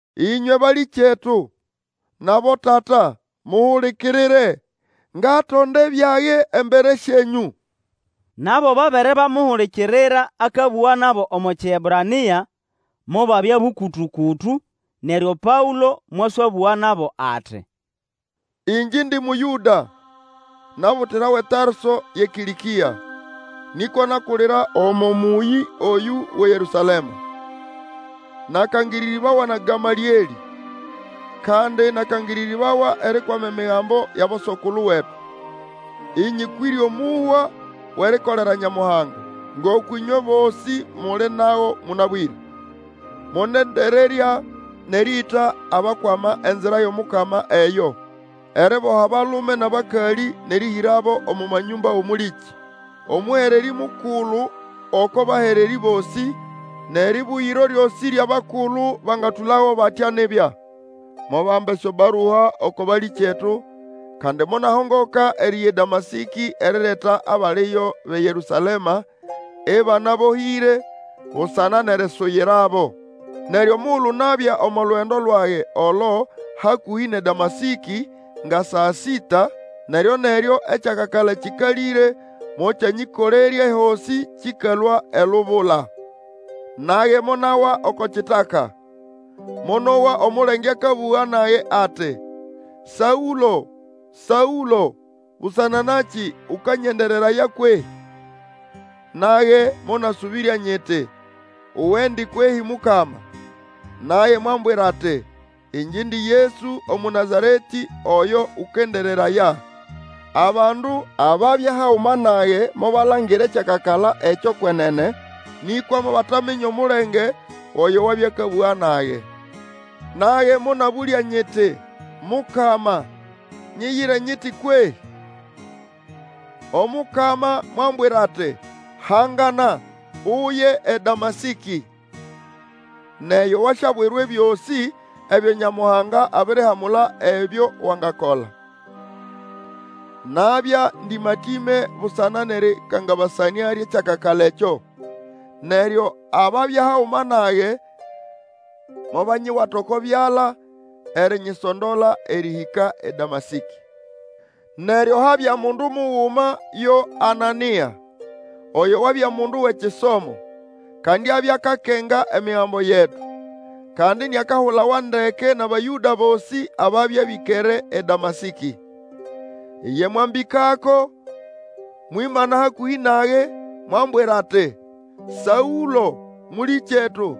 Ĩnywe balĩkyetu, nʼabotata, muhulikirire, ngatonda ebyage embere syenyũ! Nabo babere bakamuhulikirira akabũga nabo omo Kiebrania, mobabya bũkũtũ-kũtũ, neryo Paũlo mwaswabũga ati, Ĩngye indi Mũyũda, nabutirawa eTarso yʼeKĩlĩkĩa, nĩkwa nakulira omo mũyĩ oyũ wʼeYerũsalema. Nakangĩrĩrĩbawa na Gamalĩelĩ, kandi nakangĩrĩrĩbawa erikwama Emigambo yʼaboso-kulu wetu, ĩnyĩkwĩre omũhwa wʼerikolera Nyamuhanga, ngoko ĩnywe bosĩ muli nago mũnabwĩre. Monendererya nʼerĩĩta abakwama Enzira yʼomukama eyo, eriboha abalume nʼabakalĩ, nʼerĩhĩrabo omo manyũmba wʼomũlĩkĩ. Omũhererĩ mukulu oko bahererĩ bosĩ, nʼerĩbũgĩro lyosĩ lyʼabakulu bangatũlago batya nibya. Mobamba esyobarua oko balĩkyetu, kandi monahongoka eriya eDamasĩkĩ erireta abaliyo bʼeYerũsalema ĩbanabohĩre, busana nʼerisuyirabo. Neryo omugulu nabya omo lugendo lwage olo hakũhĩ nʼeDamasĩkĩ nga saa sĩta, neryo-neryo ekyakakala kĩkalĩre mokyanyĩkolerya ehosĩ kĩkalũa elubula. Nage monawa oko kitaka, monowa omulenge akabũga nage ati, Saũlo, Saũloĩ! Busana nakĩ ũkanyendereraya kwehĩ? Nage monasũbĩrya nyiti, Uwendi kwehĩ Mukama? Naye mwambwira ati, Ĩngye indi Yesu Omũnazaretĩ, oyo ũkendereraya. Abandu ababya haguma nage mobalangira ekyakakala ekyo kwenene, nĩkwa mobataminya omulenge wʼoyo wabya akabũga nage. Nage monabũlya nyiti, Mukama, nyiyire nyiti kwehĩ? Omukama mwambwira ati, Hangana, uye eDamasĩkĩ, nʼeyo wasyabwirwa ebyosĩ ebyo Nyamuhanga abirihamula ebyo wangakola. Nabya ndĩmatĩme busana nʼerĩkangabasanĩa lyʼekyakakala ekyo, neryo ababya haguma nage mobanyiwata oko byala erinyisondola erĩhĩka eDamasĩkĩ. Neryo habya mundu muguma yo Anania, oyo wabya mundu wʼekisomo, kandi abya akakenga Emigambo yetu, kandi iniakahulawa ndeke nʼAbayũda bosĩ ababya bĩkere eDamasĩkĩ. Iye mwambĩkako, mwimana hakũhĩ nage, mwambwira ati, Saũlo, mũlĩkyetu,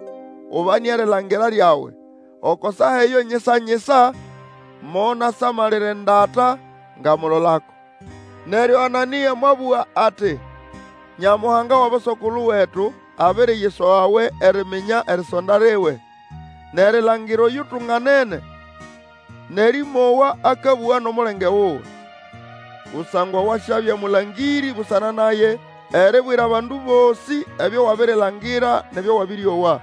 ubane erilangira lyawe! Oko saa eyo nyisa-nyisa monasamalira endata ngamulolako. Neryo Anania mwabũga ati, Nyamuhanga wʼaboso-kulu wetu abiriyisogawe eriminya erisonda liwe, nʼerilangira Oyutunganene, nʼerĩmowa akabũga nʼomulenge wuwe. Kusangwa wasyabya mũlangĩrĩ busana naye, eribwira abandu bosĩ ebyo wabirilangira nʼebyo wabĩrĩowa.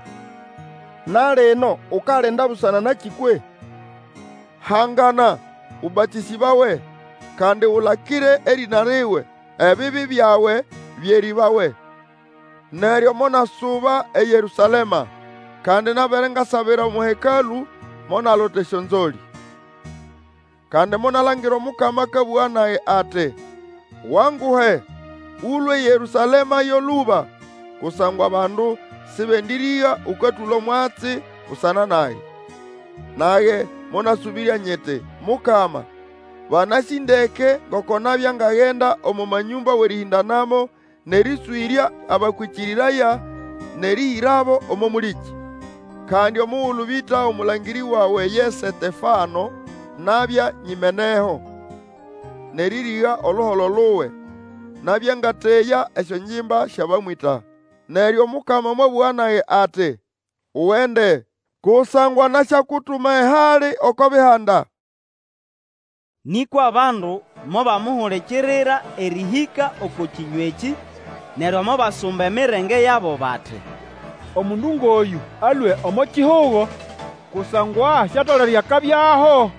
Na lino, ukalinda busana nakĩ kwehĩ? Hangana, ũbatĩsĩbawe, kandi Ulakire erĩna liwe, ebibi byawe byerĩbawe. Neryo monasuba eYerũsalema, kandi nabere ngasabira omo Hekalũ, monalota esyonzolĩ. Kandi monalangira Omukama akabũga nage ati, Wanguhe, Ũlũe eYerũsalema yo lũba, kusangwa bandu sĩbendĩrĩga ũkatũla omwatsi busana nage. Nage monasũbĩrya nyiti, Mukama, banasĩ ndeke ngoko nabya ngagenda omo manyũmba wʼerĩhĩndanamo nʼerĩswĩrya abakwĩkĩrĩraya nʼerĩhĩrabo omo mũlĩkĩ. Kandi omugulu bĩta omũlangĩrĩ wawe ye Setefano, nabya nyimeneho nʼerĩrĩga oluholo luwe, nabya ngateya esyongimba syʼabamwĩta. Neryo Omukama mwabũga nage ati, Ugende! Kusangwa nasyakutuma ehali oko Bihanda. Nĩkwa bandu mobamuhulikirira erĩhĩka oko kĩnywa ekĩ, neryo mobasumba emirenge yabo bati, Omundu ngʼoyũ alũe omo kihugo, kusangwa siatolere akabyaho!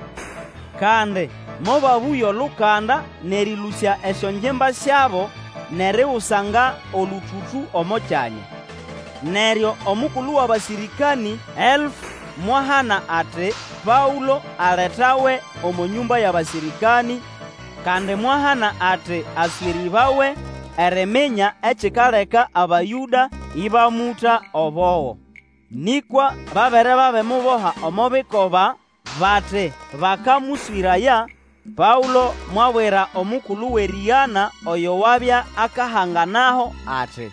Kandi mobabũya olukanda nʼerĩlũsya esyongimba syabo nʼerigusanga olũtũtũ omo kyanya. Neryo omukulu wʼabasĩrĩkanĩ elfu mwahana ati, Paũlo aletawe omo nyũmba yʼabasĩrĩkanĩ, kandi mwahana ati aswĩrĩbawe eriminya ekikaleka Abayũda ĩbamũta obogo. Nĩkwa babere babimuboha omo bikoba bati bakamũswĩraya, Paũlo mwabwira omukulu wʼerĩgana oyo wabya akahanganaho, ati,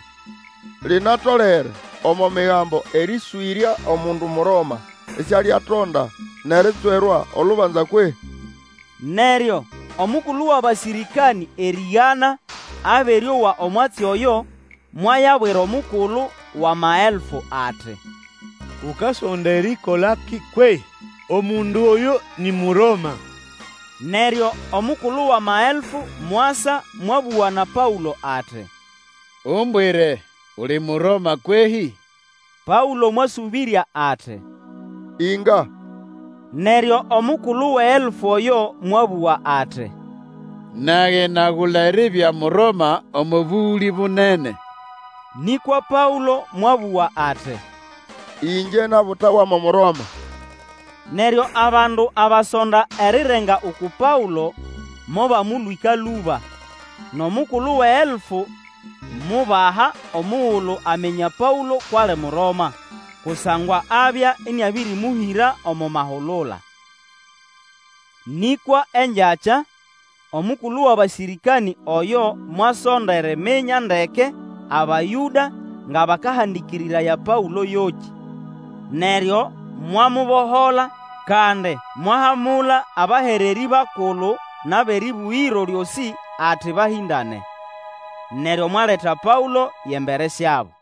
Linatolere omo Migambo erĩswĩrya omundu Muroma isialiatonda nʼeritswerwa olubanza kwehĩ? Neryo omukulu wʼabasĩrĩkanĩ erĩgana abere owa omwatsi oyo, mwayabwira omukulu wʼamaelfu ati, Ukasonda erikolakĩ kwehĩ? Omundu oyũ ni Muroma! Neryo omukulu wʼamaelfu mwasa mwabũga na Paũlo ati, Umbwire, uli Muroma kwehĩ? Paũlo mwasũbĩrya ati, Inga. Neryo omukulu wʼeelfu oyo mwabũga ati, Nage nagula eribya Muroma omo bũgũlĩ bunene. Nĩkwa Paũlo mwabũga ati, Ĩngye nabutawa mo Muroma. Neryo abandu abasonda erirenga uku Paũlo, mobamũlwĩka lũba, nʼomukulu wʼeelfu mubaha omugulu aminya Paũlo kwʼali Muroma, kusangwa abya ĩnĩabĩrĩmũhĩra omo mahulula. Nĩkwa engyakya, omukulu wʼabasĩrĩkanĩ oyo mwasonda eriminya ndeke Abayũda nga bakahandĩkĩrĩraya Paũlo yokĩ. Neryo mwamubohola, kandi mwahamula abahererĩ bakulu nʼabʼerĩbũgĩro lyosĩ ati bahĩndane. Neryo mwaleta Paũlo yʼembere syabo.